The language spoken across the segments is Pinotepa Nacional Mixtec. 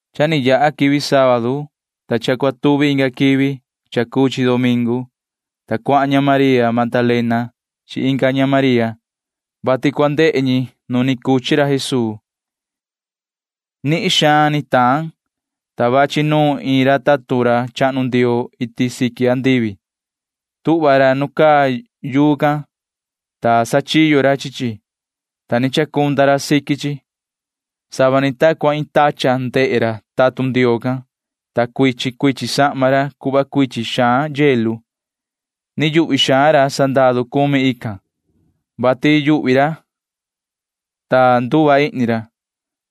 Cha ni yaha quivi sábadu, ta cha cua tuvi inga quivi cha cuu chi domingu, ta cuahan ña María Magdalena chi inga ña María, vati cua ndehe ñi nu ni cuchi ra Jesuu. Nihin xaan ni taan, ta vachi nuun iin ra tatun ra chahnu Ndioo iti siqui andivi. Tuhva ra nu caa yuu can, ta sachiyo ra chi chi, ta ni chacunda ra siqui chi. Sava ni ta cua iin tachan ndehe ra tatun Ndioo can, ta cuichin cuichin sahma ra cuhva cuichin xaan hielo. Nihin xaan naquisi chi chi ra sandaru cumi ican, vati yuhvi ra, ta nduva ihni ra.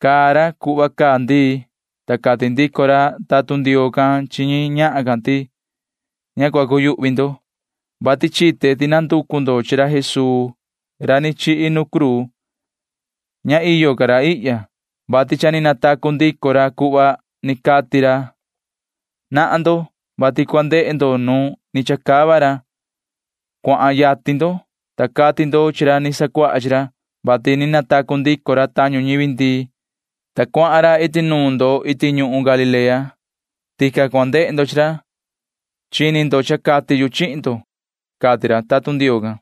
Caa ra cuhva caa ndii, ta cati ndico ra tatun Ndioo can chi ñi ñahan can ti: ―Ña cua cuyuhvi ndo, vati chite ti nanducu ndo chi ra Jesuu ra ni chihi nu cruu. Ña iyo ca ra ihya, vati cha ni natacu ndico ra cuhva ni cati ra. Nahan ndo, vati cua ndehe ndo nu ni chacava ra. Cuahan yatin ndo, ta cati ndo chi ra ni sacuaha chi ra, vati ni natacu ndico ra tañu ñivi ndii, ta cuahan ra iti nuun ndo iti ñuhun Galilea. Tican cua ndehe ndo chi ra. Chini ndo, vati cha cati yu chihin ndo ―cati ra tatun Ndioo can.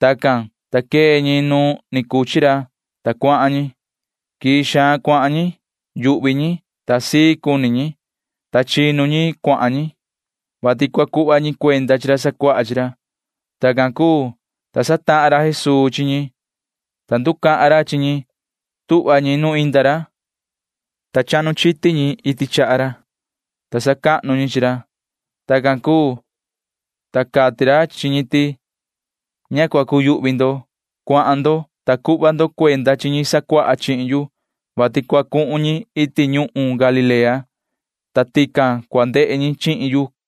Tacan, ta quee ñi nu ni cuchi ra, ta cuahan ñi. Quii xaan cuahan ñi. Yuhvi ñi, ta sii cuni ñi, ta chinu ñi cuahan ñi, vati cua cuhva ñi cuenda chi ra sacuaha chi ra. Tacan cuu, ta satahan ra Jesuu chi ñi, ta nducahan ra chi ñi. Tuhva ñi nu inda ra, ta chahnu chiti ñi chaha ra, ta sacahnu ñi chi ra. Tacan cuu, ta cati ra chi ñi ti: ―Ña cua cuyuhvi ndo. Cuahan ndo, ta cuhva ndo cuenda chi ñi sacuaha chihin yu, vati cua cuhun ñi iti ñuhun Galilea, ta tican cua ndehe ñi chihin yu ―cati ra.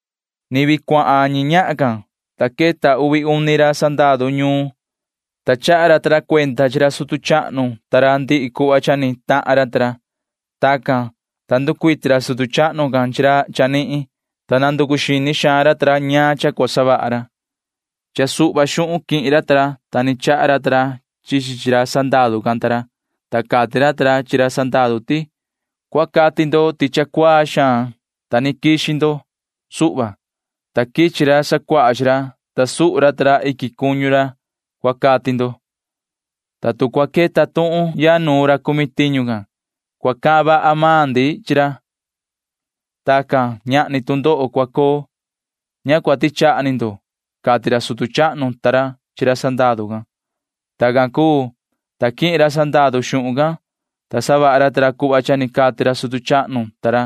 Ni vii cuahan ñi ñahan can, ta queta uvi uni ra sandaru ñuun, ta chaha ra ta ra cuenda chi ra sutu chahnu ta ra ñaan ndihi cuhva ni tahan ra ta ra. Tacan, ta nducuiti ra sutu chahnu can chi ra chanihin, ta nanducu xini xaan ra ta ra ñaan cha cua savaha ra. Cha suhva xuhun quihin ra ta ra, ta ni chaha ra ta ra chi chi chi ra sandaru can ta ra, ta cati ra ta ra chi ra sandaru ti: ―Cua cati ndo ti cha cuaa xaan, ta ni quixi ndo suhva, ta quichi ra sacuaha chi ra, ta suhu ra ta ra iquin cuñu ra, cua cati ndo, ta tu cua queta tuhun ya nuun ra cumi tiñu can, cua sandumani ndi chi ra, ta cua casi maan ndi. Ña cua tichaha ni ndo ―cati ra sutu chahnu ta ra chi ra sandaru can. Tacan cuu, ta quihin ra sandaru xuhun can, ta savaha ra ta ra cuhva cha ni cati ra sutu chahnu ta ra.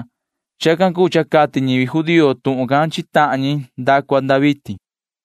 Chacan cuu cha cati ñivi judío tuhun can chi tahan ñi nda cua nda vitin.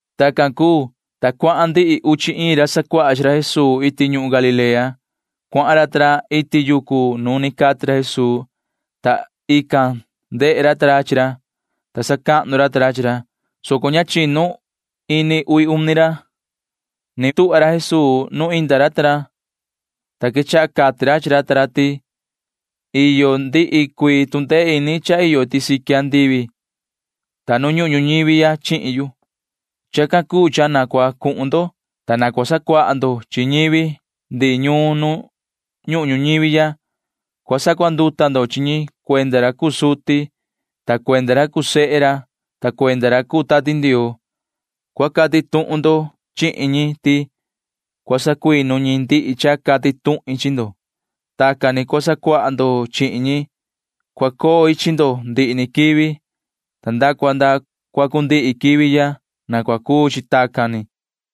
Tacan cuu, ta cuahan ndihi uchi iin ra sacuaha chi ra Jesuu iti ñuhun Galilea. Cuahan ra ta ra iti yucu nu ni cati ra Jesuu, ta ican ndehe ra ta ra chi ra, ta sacahnu ra ta ra chi ra, soco ña chinu ini uvi uni ra. Ni tuhva ra Jesuu nu inda ra ta ra, ta quechaha cati ra chi ra ta ra ti: ―Iyo ndihi cuii tu ndee ini cha iyo iti siqui andivi ta nu ñuhun ñuñivi ya chihin yu. Chacan cuu cha na cua cuhun ndo, ta na cua sacuaha ndo chi ñivi ndihi ñuun nu ñuhun ñuñivi ya. Cua sacuanduta ndo chi ñi cuenda ra cuu suti ta cuenda ra cuu sehe ra ta cuenda ra cuu Tati Ndioo. Cua cati tuhun ndo chihin ñi ti cua sacuinu ñi ndihi cha cati tuhin chi ndo. Tacan ni cua sacuaha ndo chihin ñi. Cua coi chi ndo ndihi ni quivi nda cua nda cua cundihi quivi ya. Na cua cuu chi tacan ni ―cati ra Jesuu chi ra sacuaha chi ra.